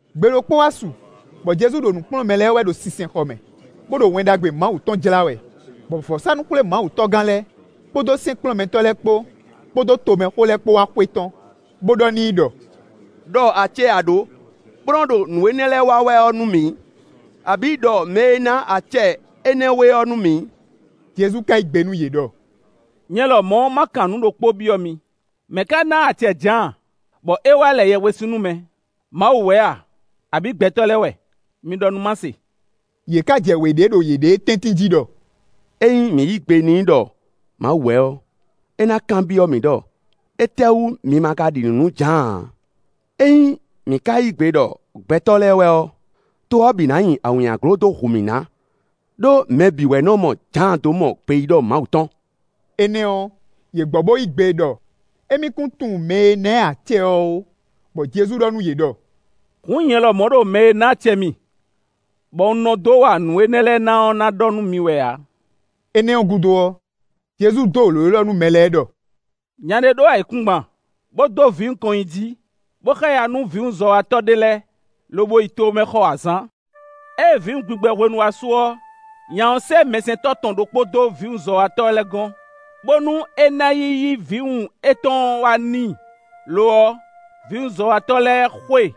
Gbe ɖokpó wá su, bɔ Jezu ɖo nǔ kplɔ́n mɛ lɛ́ɛ wɛ ɖo sinsɛnxɔ mɛ, bó ɖo Wɛn Ɖagbe Mawu tɔn jlá wɛ, bɔ vɔ̌sánú-xwlémawutɔ́gán lɛ́ɛ, kpódó sɛ́nkplɔ́nmɛtɔ́ lɛ́ɛ kpó, kpódó tomɛxó lɛ́ɛ kpó wá xwetɔ́n, bó ɖɔ n'i ɖɔ: “Đɔ acɛ e a ɖǒ, bó nɔ ɖo nǔ énɛ́ lɛ́ɛ wa wɛ ɔ́ nú mǐ; abǐ, ɖɔ mɛ e ná acɛ énɛ́ we ɔ́ nú mǐ.” Jezu ka yí gbe nú yě ɖɔ: “Nyɛ lɔmɔ̌ ma kan nǔ ɖokpó byɔ́ mi: mɛ̌ ká ná acɛ Jǎan, bɔ é wá lɛ yɛhwesin nú mɛ? Mawu wɛ a? Abǐ gbɛtɔ́ lɛ́ɛ wɛ? Mi ɖɔ nú má se.” Yě ká jɛ wě ɖe ɖo yěɖée tɛ́ntin jí ɖɔ: “Ényí mǐ yí gbe n'i ɖɔ Mawu wɛ ɔ́, é ná kanbyɔ́ mǐ ɖɔ: ‘Étɛ́wú mi ma ka ɖi nǔ nú Jǎan ǎ?’ Ényí mǐ ka yí gbe ɖɔ gbɛtɔ́ lɛ́ɛ wɛ ɔ́, to ɔ́ bǐ ná nyi awǐnnyaglo dó hu mǐ ná, ɖó mɛ bǐ wɛ nɔ mɔ Jǎan dó mɔ gbeyíɖɔ Mawu tɔn.” Énɛ́ ɔ́, yě gbɔ bó yí gbe ɖɔ émí kún tunwun mɛ e ná ɛ acɛ ɔ́ ó. Bɔ Jezu ɖɔ nú yě ɖɔ: “Hǔn nyɛ lɔ ɖo mɛ e ná acɛ mì bɔ un nɔ dó wa nǔ énɛ́ lɛ́ɛ na ɔ́ na ɖɔ nú mi wɛ ǎ.” Énɛ́ ɔ́ gúdo ɔ́, Jezu dó lǒ élɔ́ nú mɛ lɛ́ɛ ɖɔ: “Nya ɖé ɖó ayǐkúngban, bó dó vǐwun kɔn nyi jí, bó xáya nú vǐwunzɔ́watɔ́ ɖé lɛ́ɛ, lobo yi tomɛ xɔ azǎn. Ée vǐwun gbigbɛ hwenu wá su ɔ́, nya ɔ́ sɛ́ mɛsɛntɔ́ tɔn ɖokpó dó vǐwunzɔ́watɔ́ lɛ́ɛ gɔ́n, bónú é ná yi yí vǐwun étɔn wá n'i. Lo ɔ́, vǐwunzɔ́watɔ́ lɛ́ɛ xo e,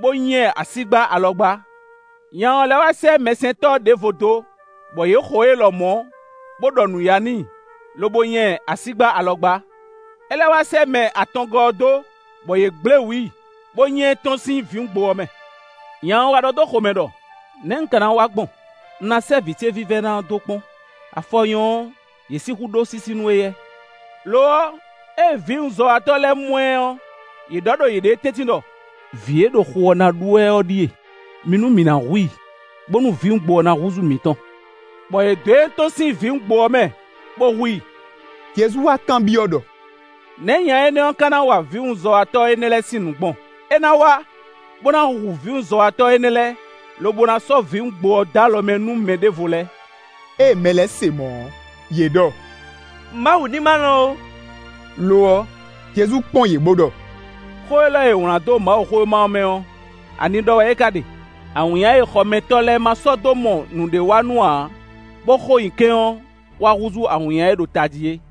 bó nya ɛ asígbá alɔgbá. Nya ɔ́ lɛ́ wá sɛ́ mɛsɛntɔ́ ɖěvo dó, bɔ yě xo é lɔmɔ̌, bó ɖɔ nǔyá n'i, lobo nya ɛ asígbá alɔgbá. É lɛ́ wá sɛ́ mɛ atɔngɔ́ ɔ́ dó, bɔ yě gblé wǔ i, bó nya ɛ tɔ́n sín vǐwungbo ɔ́ mɛ. Nya ɔ́ wá ɖɔ dó xomɛ ɖɔ: ‘Nɛ̌ un ka ná wa gbɔn? Un ná sɛ́ vǐ ce vívɛ́ná ɔ́ dó kpɔ́n; afɔ nyɔ́ ɔ́, yě sixú ɖó sísí nú éyɛ́.’ Lo ɔ́, ée vǐwunzɔ́watɔ́ lɛ́ɛ mɔ ɛ ɔ́, yě ɖɔ ɖo yěɖée tɛ́ntin ɖɔ: ‘Vǐ e ɖo xu ɔ́ ná ɖu wɛ ɔ́ ɖíe. Mi nú mǐ ná hu i, bónú vǐwungbo ɔ́ ná húzú mǐtɔn.’ Bɔ yě dɔn ɛ tɔ́n sín vǐwungbo ɔ́ mɛ, bó hu i.” Jezu wá kanbyɔ́ ɖɔ: “Nɛ̌ nya énɛ́ ɔ́ ka ná wa vǐwunzɔ́watɔ́ énɛ́ lɛ́ɛ sín nǔ gbɔn?” “É ná wá, bó ná hu vǐwunzɔ́watɔ́ énɛ́ lɛ́ɛ, lobo ná sɔ́ vǐwungbo ɔ́ dó alɔ mɛ nú mɛ ɖěvo lɛ́ɛ.” Ée mɛ lɛ́ɛ se mɔ̌ ɔ́, yě ɖɔ: “Mawu ní ma lɔn ó.” Lo ɔ́, Jezu kpɔ́n yě bó ɖɔ: “Xó élɔ́ e è wlǎn dó Mawuxówéma ɔ́ mɛ ɔ́, ani ɖɔ wɛ é ka ɖe: ‘Awǐnnya e xɔmɛtɔ́ lɛ́ɛ ma sɔ́ dó mɔ nǔɖéwanú ǎ, bó xo nyi kɛ́n ɔ́, wá húzú awǐnnya e ɖo tají é.’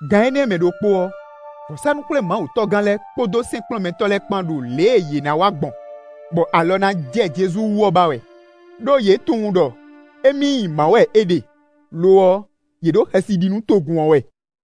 Gan énɛ́ mɛ ɖokpó ɔ́, vɔ̌sánú-xwlémawutɔ́gán lɛ́ɛ kpódó sɛ́nkplɔ́nmɛtɔ́ lɛ́ɛ kpán ɖo lě e yě ná wa gbɔn, bɔ alɔ ná jɛ Jezu wú ɔ́ ba wɛ, ɖó yě tunwun ɖɔ émí nyi mǎ wɛ é ɖe; lo ɔ́, yě ɖo xɛsi ɖi nú togun ɔ́ wɛ.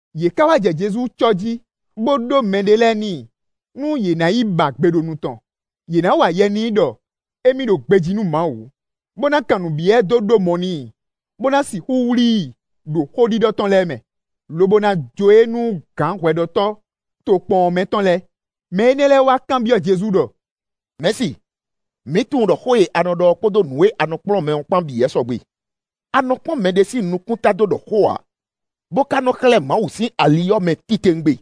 Yě ká wá jɛ Jezu cɔ́ jí, bó ɖó mɛɖé lɛ́ɛ n'i, nú yě ná yi ba gbe ɖo nu tɔn. Yě ná wa yɛ n'i ɖɔ émí ɖo gbejí nú Mawu, bó ná kan nǔ byɔ́ ɛ dó ɖó mɔ n'i, bó ná sixú wlí i ɖo xó ɖiɖɔ tɔn lɛ́ɛ mɛ, lobo ná jó e nú gǎn hwɛɖɔtɔ́ tokpɔn ɔ́ mɛ tɔn lɛ́ɛ. Mɛ énɛ́ lɛ́ɛ wá kanbyɔ́ Jezu ɖɔ: “Mɛ̌si, mǐ tunwun ɖɔ xó e a nɔ ɖɔ ɔ́ kpódó nǔ e a nɔ kplɔ́n mɛ ɔ́ kpan bǐ wɛ sɔgbe. A nɔ kpɔ́n mɛɖé sín nukúnta dó ɖɔ xó ǎ, bó ka nɔ xlɛ́ Mawu sín ali ɔ́ mɛ titewungbe.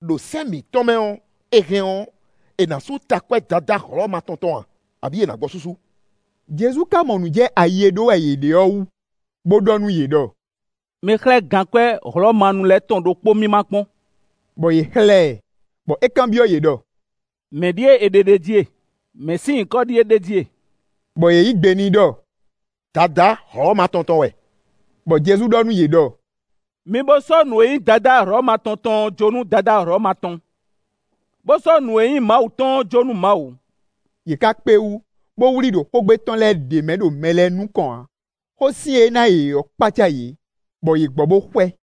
Đo sɛ́n mǐtɔn mɛ ɔ́, è hɛn ɔ́, è nǎ sú takwɛ́ Dadá Hlɔ̌ma tɔn tɔn a, abǐ è nǎ gbɔ súsú?” Jezu ka mɔ nǔ jɛ ayi e ɖó wɛ yě ɖe ɔ́ wú, bó ɖɔ nú yě ɖɔ: “Mi xlɛ́ gankwɛ́ Hlɔ̌manu lɛ́ɛ tɔn ɖokpó mì ma kpɔ́n;” bɔ yě xlɛ́ ɛ, bɔ é kanbyɔ́ yě ɖɔ: “Mɛ̌ ɖíe è ɖe ɖ'é jí e? Mɛ̌ sín nyǐkɔ ɖíe ɖ'é jí e?” Bɔ yě yí gbe n'i ɖɔ: “Dadá Hlɔ̌ma tɔn tɔn wɛ.” Bɔ Jezu ɖɔ nú yě ɖɔ: “Mi bó sɔ́ nǔ e nyí Dadá Hlɔ̌ma tɔn tɔn ɔ́ jó nú Dadá Hlɔ̌ma tɔn, bó sɔ́ nǔ e nyí Mawu tɔn ɔ́ jó nú Mawu.” Yě ká kpé wú, bó wlí i ɖo xógbe tɔn lɛ́ɛ ɖě mɛ ɖo mɛ lɛ́ɛ nukɔn ǎ. Xósin e é ná yě ɔ́ kpácá yě, bɔ yě gbɔ bó xwɛ. Mɛkúkú lɛ́ɛ ná fɔ́n a?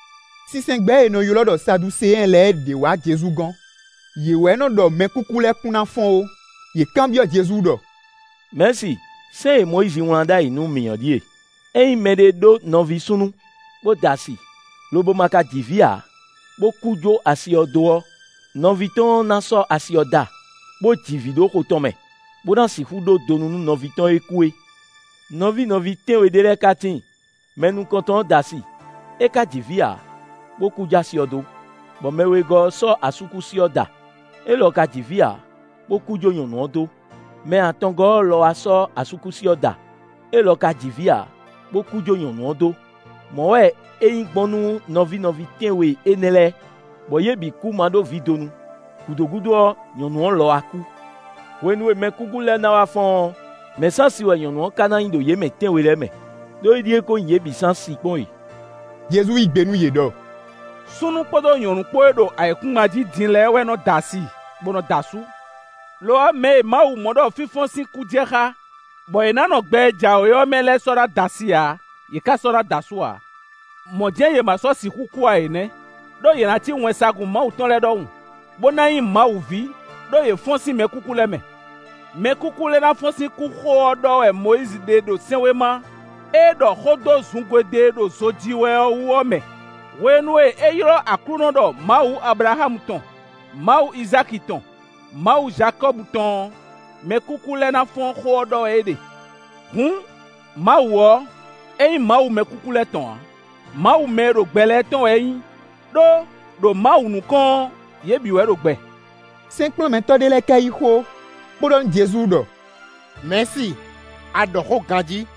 Sinsɛngbɛ́ e è nɔ ylɔ́ ɖɔ Saduseɛn lɛ́ɛ ɖě wǎ Jezu gɔ́n. (Yě wɛ nɔ́ ɖɔ mɛkúkú lɛ́ɛ kún ná fɔ́n ó). Yě kanbyɔ́ Jezu ɖɔ: “Mɛ̌si, sɛ́n e Mɔyízi wlán ɖ'ayǐ nú mǐ ɔ́ ɖíe: ‘Ényí mɛɖé ɖó nɔví súnnu, bó da asi, lobo ma ka ji vǐ ǎ, bó kú jó asi ɔ́ dó ɔ́, nɔví tɔn ɔ́ ná sɔ́ asi ɔ́ da, bó ji vǐ ɖo xo tɔn mɛ, bó ná sixú ɖó donu nú nɔví tɔn e kú é.’ Nɔví nɔví tɛ́nwe ɖé lɛ́ɛ ka tíin. Mɛ nukɔntɔn ɔ́ da asi; é ka ji vǐ ǎ, bó kú jó asi ɔ́ dó, bɔ mɛ wegɔ́ ɔ́ sɔ́ asúkúsi ɔ́ da; élɔ́ ka ji vǐ ǎ, bó kú jó nyɔ̌nu ɔ́ dó; mɛ atɔngɔ́ ɔ́ lɔ wá sɔ́ asúkúsi ɔ́ da; élɔ́ ka ji vǐ ǎ, bó kú jó nyɔ̌nu ɔ́ dó. Mɔ̌ wɛ é nyí gbɔn nú nɔví nɔví tɛ́nwe énɛ́ lɛ́ɛ, bɔ yě bǐ kú ma ɖó vǐ donu; gǔdo gúdo ɔ́, nyɔ̌nu ɔ́ lɔ wá kú.” Hwenu e mɛkúkú lɛ́ɛ ná wá fɔ́n ɔ́, mɛ̌ sín asi wɛ nyɔ̌nu ɔ́ ka ná nyí ɖo yě mɛ tɛ́nwe lɛ́ɛ mɛ? Đó éɖíe ko nyí yě bǐ sín asi kpɔ́n e. Jezu yí gbe nú yě ɖɔ: “Súnnu kpódó nyɔ̌nu kpó e ɖo ayǐkúngban jí din lɛ́ɛ wɛ nɔ da asi, bó nɔ da asú. Lo ɔ́, mɛ e Mawu mɔ ɖɔ fínfɔ́n sín kú jɛ xá, bɔ yě ná nɔ gbɛ e jǎwe ɔ́ mɛ lɛ́ɛ sɔ́ na da asi ǎ, yě ká sɔ́ na da asú ǎ. Mɔ̌ jɛ́n yě ma sɔ́ sixú kú ǎ é nɛ́; ɖó yě ná cí wɛnsagun Mawu tɔn lɛ́ɛ ɖɔhun, bó ná nyí Mawu ví, ɖó yě fɔ́n sín mɛkúkú lɛ́ɛ mɛ. Mɛkúkú lɛ́ɛ ná fɔ́n sín kú xó ɔ́ ɖɔ wɛ Mɔyízi ɖe ɖo sɛ́nwéma e ɖɔ xó dó zungodwe e ɖo zo ji wɛ ɔ́ wú ɔ́ mɛ; hwenu e é ylɔ́ Aklúnɔ ɖɔ Mawu Ablaxámu tɔn, Mawu Izáki tɔn, Mawu Jakɔ́bu tɔn ɔ́, mɛkúkú lɛ́ɛ ná fɔ́n xó ɔ́ ɖɔ wɛ é ɖe. Hǔn, Mawu ɔ́, é nyí Mawu mɛkúkú lɛ́ɛ tɔn ǎ; Mawu mɛ e ɖo gbɛ lɛ́ɛ tɔn wɛ é nyí; ɖó, ɖo Mawu nukɔn ɔ́, yě bǐ wɛ ɖo gbɛ.” Sɛ́nkplɔ́nmɛtɔ́ ɖé lɛ́ɛ ka yí xó, bó ɖɔ nú Jezu ɖɔ: “Mɛ̌si, a ɖɔ xó ganjí.”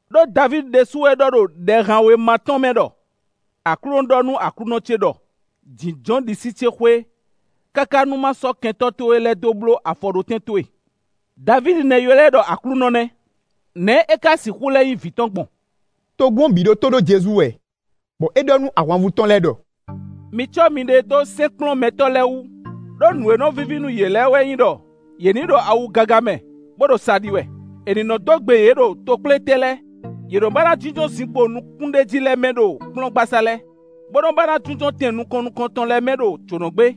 Đó Davídi ɖésú wɛ ɖɔ ɖo Ɖɛhanwéma tɔn mɛ ɖɔ: ‘Aklúnɔ ɖɔ nú Aklúnɔ ce ɖɔ: Jǐnjɔ́n ɖisí ce xwé, káká nú má sɔ́ kɛntɔ́ towe lɛ́ɛ dó bló afɔɖótɛn towe.’ Davídi nɛ́ ylɔ́ ɛ ɖɔ Aklúnɔ nɛ́; nɛ̌ é ka sixú lɛ́ nyí vǐ tɔn gbɔn?” Togun ɔ́ bǐ ɖo tó ɖó Jezu wɛ, bɔ é ɖɔ nú ahwanvú tɔn lɛ́ɛ ɖɔ: “Mi cɔ́ miɖée dó sɛ́nkplɔ́nmɛtɔ́ lɛ́ɛ wú, ɖó nǔ e nɔ víví nú yě lɛ́ɛ wɛ nyí ɖɔ: yě ní ɖo awu gaga mɛ, bó ɖo sa ɖi wɛ; è nǐ nɔ́ dó gbe yě ɖo tokplétɛn lɛ́ɛ; yě nɔ́ ba ná jínjɔ́n zinkpo nukúnɖéjí lɛ́ɛ mɛ ɖo kplɔ́ngbasá lɛ́ɛ, bó nɔ́ ba ná jínjɔ́n tɛn nukɔn nukɔntɔn lɛ́ɛ mɛ ɖo jǒnɔgbé.”